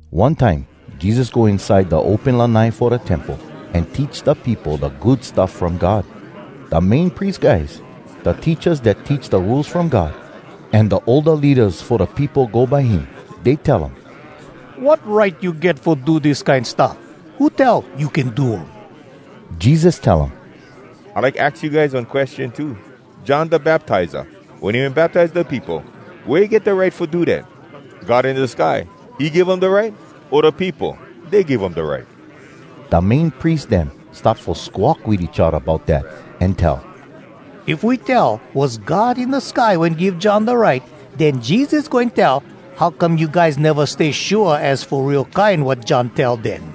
One time Jesus go inside da open lanai fo da Temple, an teach da peopo da Good Stuff From God. Da Main Pries guys, da teachas dat teach da Rules From God, an da older leadas fo da peopo go by him. Dey tell um, “Wat right you get fo do dis kine stuff? Who tell you can do um?” Jesus tell um, “I like aks you guys one question too. John Da Baptiza, wen he wen baptize da peopo, wea he get da right fo do dat? God in da sky, he give um da right? O da peopo, dey give um da right?” Da Main Pries dem start fo squawk wit each odda bout dat, an tell, “If we tell, ‘Was God in da sky wen give John da right,’ den Jesus goin tell, ‘How come you guys neva stay shua az fo real kine wat John tell, den?’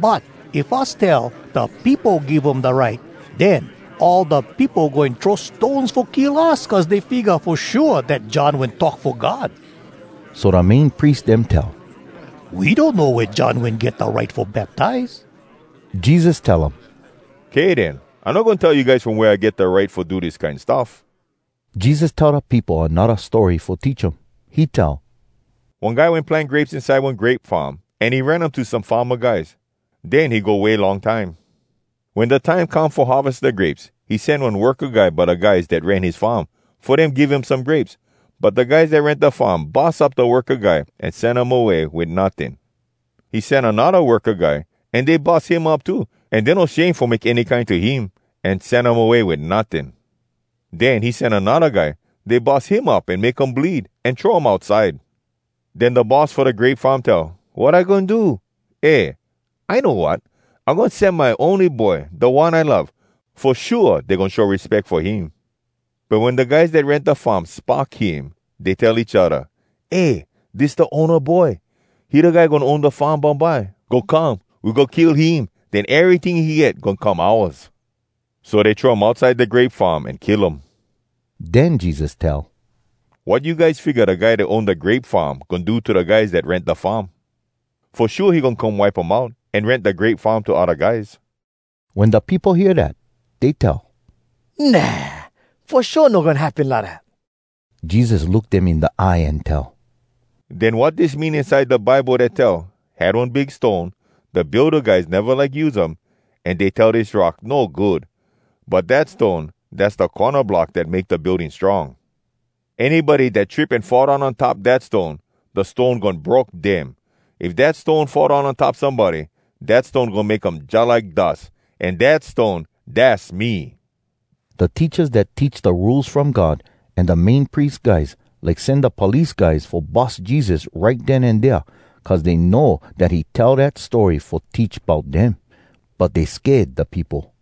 But if us tell, ‘Da peopo give um da right,’ den all da peopo goin throw stones fo kill us, cuz dey figga fo shua dat John wen talk fo God.” So da Main Pries dem tell, “We donno wea John wen get da right fo baptize.” Jesus tell um, “Kay den, I no goin tell you guys from wea I get da right fo do dis kine stuff.” Jesus tell da peopo anodda story fo teach um. He tell, “One guy wen plant grapes inside one grape farm, an he rent um to some farma guys. Den he go way long time. Wen da time come fo harves da grapes, he sen one worka guy by da guys dat rent his farm, fo dem give him some grapes. But da guys dat rent da farm bus up da worka guy an sen um away wit notting. He sen anodda worka guy, an dey bus him up too, an dey no shame fo make any kine to him, an sen um away wit notting. Den he sen anodda guy. Dey bus him up an make um bleed, an throw um outside. Den da boss fo da grape farm tell, ‘Wat I goin do? Eh, I know wat! I goin sen my ony boy, da one I love. Fo shua, dey goin show respeck fo him!’ But wen da guys dat rent da farm spock him, dey tell each odda, ‘Eh, dis da owna boy. He da guy goin own da farm bumbye. Go come, we go kill him. Den eryting he get goin come ouas!’ So dey throw him outside da grape farm an kill um.” Den Jesus tell, “Wat you guys figga da guy dat own da grape farm goin do to da guys dat rent da farm? Fo shua he goin come wipe um out, an rent da grape farm to odda guys.” Wen da peopo hear dat, dey tell, “Nah! Fo shua no goin happen lidat!” Jesus look dem in da eye an tell, “Den wat dis mean inside da Bible dat tell, “‘Had one big stone, Da builda guys neva like use um, An dey tell dis rock, no good! But dat stone, Dass da corna block Dat make da building strong.’ “Anybody dat trip an fall down on top dat stone, da stone goin broke dem. If dat stone fall down on top somebody, dat stone goin make um jalike dus. An dat stone, dass me!” Da teachas dat teach da Rules From God an da Main Pries guys like sen da police guys fo bus Jesus right den an dea, cuz dey know dat he tell dat story fo teach bout dem. But dey sked da peopo.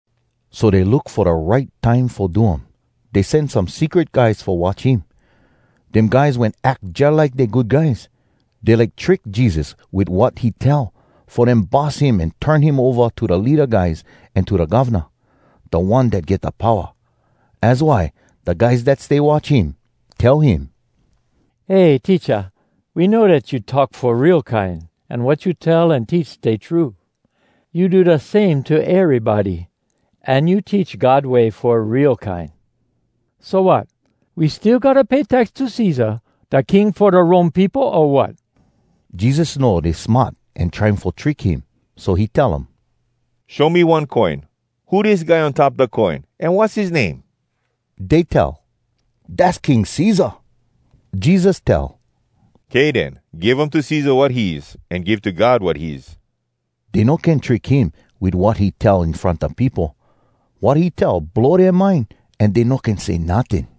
So dey look fo da right time fo do um. Dey sen some secret guys fo watch him. Dem guys wen ack jalike dey good guys. Dey like trick Jesus wit wat he tell, fo dem bus him an turn him ova to da leada guys an to da govna, da one dat get da powa. Az why da guys dat stay watch him tell him, “Eh, Teacha, we know dat you talk fo real kine an wat you tell an teach stay true. You do da same to erybody, an you teach God way fo real kine. So, wat? We still gotta pay tax to Cesar, da king fo da Rome peopo, o wat?” Jesus know dey smart an trying fo trick him, so he tell um, “Show me one coin. Who dis guy on top da coin? An wass his name?” Dey tell, “Dass King Cesar.” Jesus tell, “Kay den, give um to Cesar wat his, an give to God wat his!” Dey no can trick him wit wat he tell in front da peopo. Wat he tell blow dea mind, an dey no can say notting.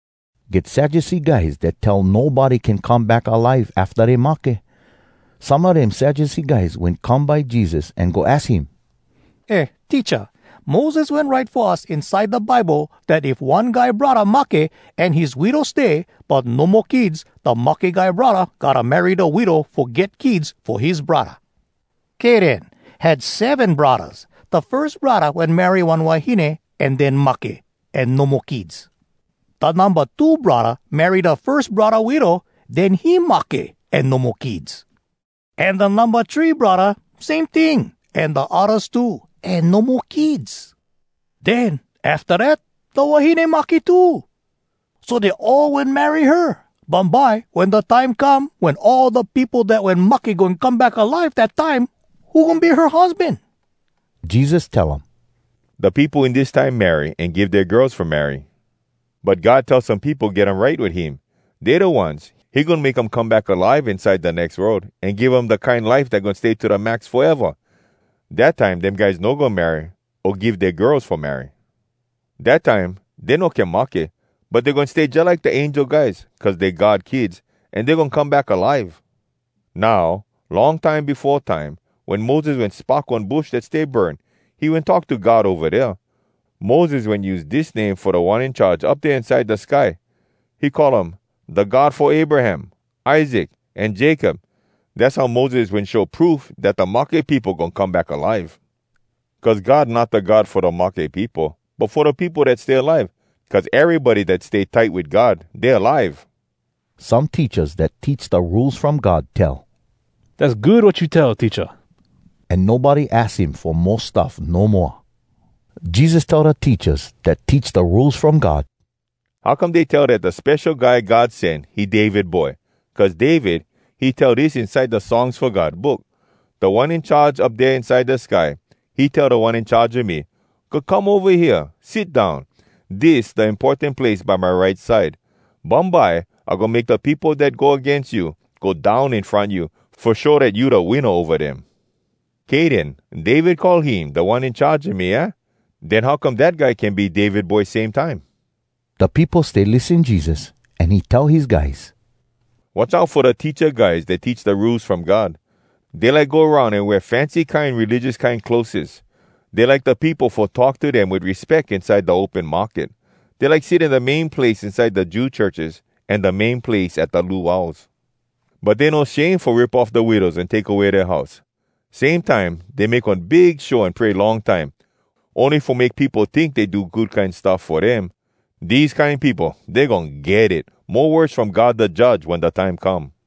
Get Sadducee guys dat tell nobody can come back alive afta dey mahke. Some a dem Sadducee guys wen come by Jesus an go aks him, “Eh, Teacha, Moses wen write fo us inside da Bible, dat if one guy braddah mahke an his widow stay, but no mo kids, da mahke guy braddah gotta marry da widow fo get kids fo his braddah. Kay den, had seven braddahs. Da firs braddah wen marry one wahine an den mahke, an no mo kids. Da numba two braddah marry da firs braddah widow, den he mahke, an no mo kids. An da numba three braddah same ting, an da oddas too, an no mo kids. Den afta dat, da wahine mahke too. So, dey all wen marry her. Bumbye, wen da time come wen all da peopo dat wen mahke goin come back alive, dat time, who goin be her husban?” Jesus tell um, “Da peopo in dis time marry an give dea girls fo marry. But God tell some peopo get um right wit him. Dey da ones, he goin make um come back alive inside da nex world, an give um da kine life dat goin stay to da max foeva! Dat time dem guys no goin marry o give dea girls fo marry. Dat time dey no can mahke, but dey goin stay jalike da angel guys. Cuz dey God kids, an dey goin come back alive. Now, long time befo time, wen Moses wen spock one bush dat stay burn, he wen talk to God ova dea. Moses wen use dis name fo Da One In Charge Up Dea Inside Da Sky—he call um ‘Da God fo Abraham, Isaac, an Jacob.’ Dass how Moses wen show proof dat da mahke peopo goin come back alive. Cuz God not da God fo da mahke peopo, but fo da peopo dat stay alive. Cuz erybody dat stay tight wit God, dey alive!” Some teachas dat teach da Rules From God tell, “Dass good wat you tell, Teacha!” An nobody aks him fo mo stuff no moa. Jesus tell da teachas dat teach da Rules From God, “How come dey tell dat da Spesho Guy God Sen, he David boy? Cuz David, he tell dis inside da Songs Fo God Book: “‘Da One In Charge Up Dea Inside Da Sky, He tell Da One In Charge a me, “Go come ova hea, sit down! Dis da importan place by my right side. Bumbye I goin make da peopo dat go agains you Go down in front you, Fo show dat you da winna ova dem.” ’ “Kay den, David call him ‘Da One In Charge a me,’ aah? Den how come dat guy can be David boy, same time?” Da peopo stay lissen Jesus, an he tell his guys, “Watch out fo da teacha guys dat teach da Rules From God. Dey like go aroun an wear fancy kine religious kine clotheses. Dey like da peopo fo talk to dem wit respeck inside da open market. Dey like sit in da main place inside da Jew churches, an da main place at da luaus. But dey no shame fo rip off da widows an take away dea house. Same time dey make one big show an pray long time, ony fo make peopo tink dey do good kine stuff fo dem. Dese kine peopo, dey goin get it mo worse from God da Judge wen da time come!”